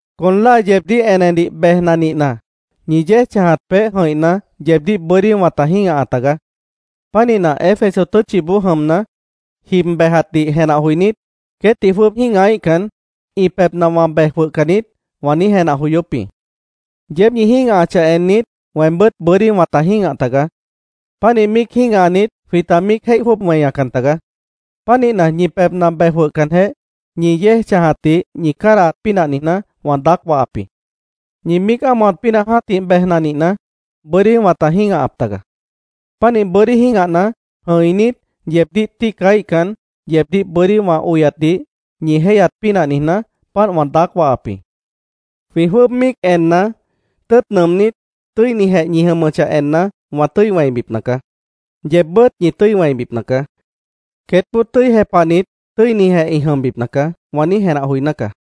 Con láa yeebdíh enedih bejna nihna, ñi yéej chãjat peéh jʉ̃ihna, yeebdíh bʉ́dí wãta jĩ́gaha tagaá. Pánihna, Éfeso tʉ́tchiboó jʉmna, jib bejatdih jenah joinít, “Queétdih jwʉ́ʉb jĩ́gahaíhcan, ĩ pebhna wã bej jwʉhcan niít”, wã niíj jenah joyóp jĩ. Yeéb ñi jĩ́gahachah ennit, weembʉ́t bʉ́dí wãta jĩ́gah tagaá. Pánih míic jĩ́gahanit, jwĩta míic jéih jwʉ́ʉb weñacan tagaá. Pánihna, ñi pebhna bej jwʉhcanjeh, ñi yéej chãjatdih ñi cádahat pínah niijná, wã daác wahap jĩ. Ñi míic ámohat pínah jã́tih bejna nihna, bʉ́dí wãta jĩ́gahap taga. Pánih bʉ́dí jĩ́gahna, jʉ̃inít, yeebdíh tíicaíhcan, yeebdíh bʉ́dí wã oyatdih ñi jéihyat pínah niijná, páant wã daác wahap jĩ. Jwĩ jwʉ́ʉb míic enna, tʉ́ʉt nʉʉmnít, tʉ́inijeh ñi jʉmʉchah enna, wã tʉ́i wẽibipna caá. Yeebbʉ́t ñi tʉ́i wẽibipna caá. “Queétboó tʉ́i jepahnit, tʉ́inijeh ĩ jʉmbipna caá”, wã niíj jenah joiná caá.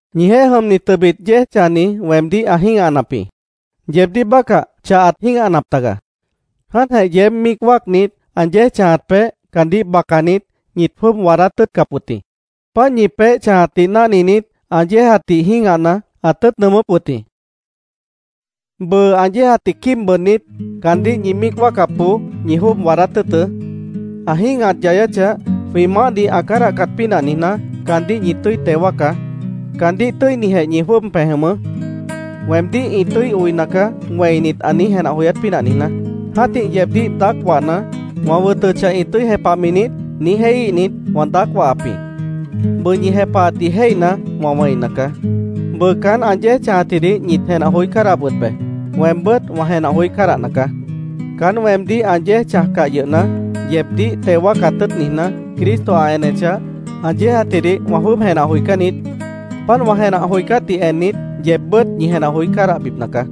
Ñijeéh jʉmni tʉbit yéej chãjni weemdíh ã jĩ́gahanap jĩ. Yeebdíh bácah chah ãt jĩ́gahanap taga. Jáantjeh yeéb míic wáacnit, ã yéej chãjat peéh, caandíh bacanit, ñit jwʉ́ʉb waadát tʉ́ʉtcap wʉt jĩ. Páant ñi peéh chãjatdih náhninit, ã yéejatdih jĩ́gahna, ãt tʉ́ʉt nʉʉmʉ́p wʉt jĩ. Bʉʉ, ã yéejatdih quíib bʉʉdnít, caandíh ñi míic wáacapboó ñi jwʉ́ʉb waadát tʉ́ʉtʉ́. Ã jĩ́gahat yayáchah, jwĩ Maáhdih ã cádahcat pínah niijná, caandíh ñi tʉ́i teo wáacá. Caandíh tʉ́inijeh ñi jwʉ́ʉb pej jʉmʉʉ́, “Weemdíh ĩ tʉ́i oina caá”, wẽinit, ã niíj jenah joyát pínah niijná. Jã́tih yeebdíh daác wahna, “¿Wã wʉtʉchah, ĩ tʉ́i jepahmi niít?” niíj jéihíhnit, wã daác wahap jĩ. Bʉʉ ñi jepahatdih jéihna, wã wẽina caá. Bʉʉ caán ã yéej chãjatjidih ñit jenah joí cádahap wʉt be. Weembʉ́t wã jenah joí cádahna caá. Caán weemdíh ã yéej chãjcah yʉhna, yeebdíh teo wáacat tʉ́ʉt niijná, Cristo ã enechah, ã yéejatjidih wã jwʉ́ʉb jenah joicán niít. Páant wã jenah joicátdih ennit, yeebbʉ́t ñi jenah joí cádahbipna caá.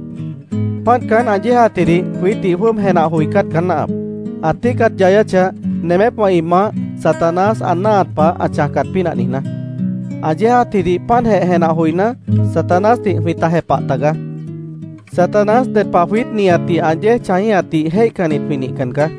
Páant caán ã yéejatjidih jwiítdih jwʉ́ʉb jenah joicát caá náahap, ã tíicat yayáchah, nemépwã ĩ maáh, Satanás, ã náahat pah ã chãjcat pínah niijná. Ã yéejatjidih páantjeh jenah joiná, Satanásdih jwĩta jepah tagaá. Satanás ded pah jwiít nihatdih ã yéej chãjíhatdih jéihcannit jwĩ nihcan caá.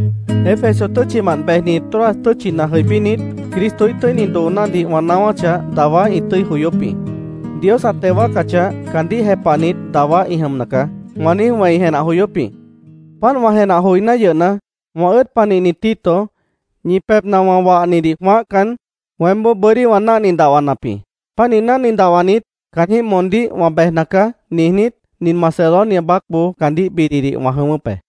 Éfeso tʉ́tchimant bejni Troas tʉ́tchina jʉibínit, Cristoíh tʉ́ini doonádih wã naáwáchah, dawá ĩ tʉ́i joyóp jĩ. “Dios ã teo wáacachah, caandíh jepahnit dawá ĩ jʉmna caá”, wã niíj wẽi jenah joyóp jĩ. Páant wã jenah joiná yʉhna, wã ʉ́ʉd panihni Tito, ñi pebhna wã wahnidih jwãáhcan, weémboó bʉ́dí wã náhni dahwanap jĩ. Pánih náhni dahwanit, caanjĩ́h moondíh “Wã bejna caá”, niijnít, nin Macedonia baácboó caandíh bididih wã jʉ̃ʉ́wʉ́p be.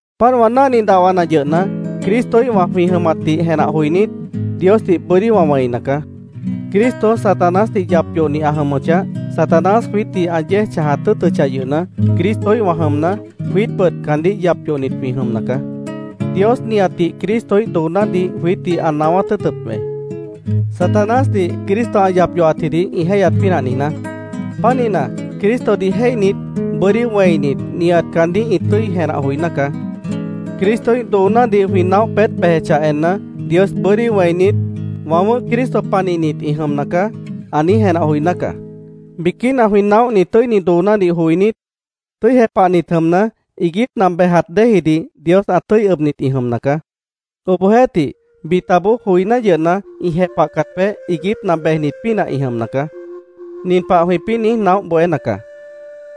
Páant wã náhni dahwana yʉhna, Cristoíhwã jwĩ jʉmatdih jenah joinít, Diosdih bʉ́dí wã wẽina caá. Cristo Satanásdih yap yohni ã jʉmʉchah, Satanás jwiítdih ã yéej chãjat tʉ́ʉtʉchah yʉhna, Cristoíhwã jʉmna, jwiítbʉt caandíh yap yohnit jwĩ jʉmna caá. Dios nihatdih Cristoíh doonádih jwiítdih ã naáwát tʉ́ʉtʉp be, Satanásdih Cristo ã yap yohatjidih ĩ jéihyat pínah niijná. Pánihna, Cristodih jéihnit, bʉ́dí wẽinit, nihat caandíh ĩ tʉ́i jenah joiná caá. Cristoíh doonádih jwĩ naóh peét bejechah enna, Dios bʉ́dí wẽinit, “Wã wʉ̃ʉ́h Cristo panihnit ĩ jʉmna caá”, ã niíj jenah joiná nacaá. Biquína jwĩ naóhni tʉ́ini doonádih joinít, tʉ́i jepahnit jʉmna, iiguípna bejat déejidih Dios ã tʉ́i ʉbnit ĩ jʉmna caá. Obohjeéhtih, bitaboó, joiná yʉhna, ĩ jepahcat peéh iiguípna bejnit pínah ĩ jʉmna caá. Nin pah jwĩpĩ́ niíj naóh bohéna caá: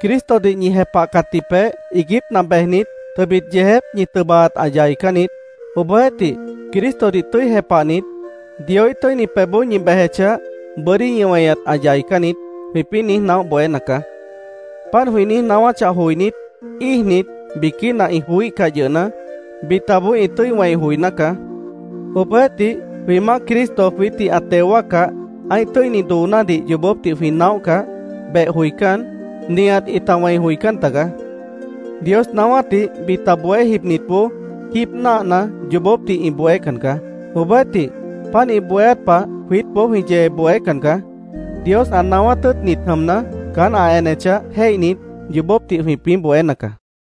“Cristodih ñi jepahcatji peéh iiguípna bejnit, tʉbit yeejép ñi tʉbaat ã yaicán niít. Obohjeéhtih, Cristodih tʉ́i jepahnit, Dioíh tʉ́ini pebhboó ñi bejechah, bʉ́dí ñi weñat ã yaicán niít”, jwĩpĩ́ niíj naóh bohéna caá. Páant, jwĩ niíj naáwáchah joinít, íijnit, biquína ĩ joííhcah yʉhna, bitaboó ĩ tʉ́i wẽi joiná caá. Obohjeéhtih, jwĩ Maáh Cristo jwiítdih ã teo wáaccah, ã́ih tʉ́ini doonádih yoobópdih jwĩ naóhcah, beh joicán, nihat ĩta wẽi joicán taga. Dios naáwátdih bita bohé jibnitboó, jíib náahna, yoobópdih ĩ bohécan caá. Obohjeéhtih, páant ĩ bohéát pah jwiítboó jwĩ yee bohécan caá. Dios ã naáwát tʉ́ʉtnit jʉmna, caán ã enechah jéihnit, yoobópdih jwĩpĩ́ bohéna caá.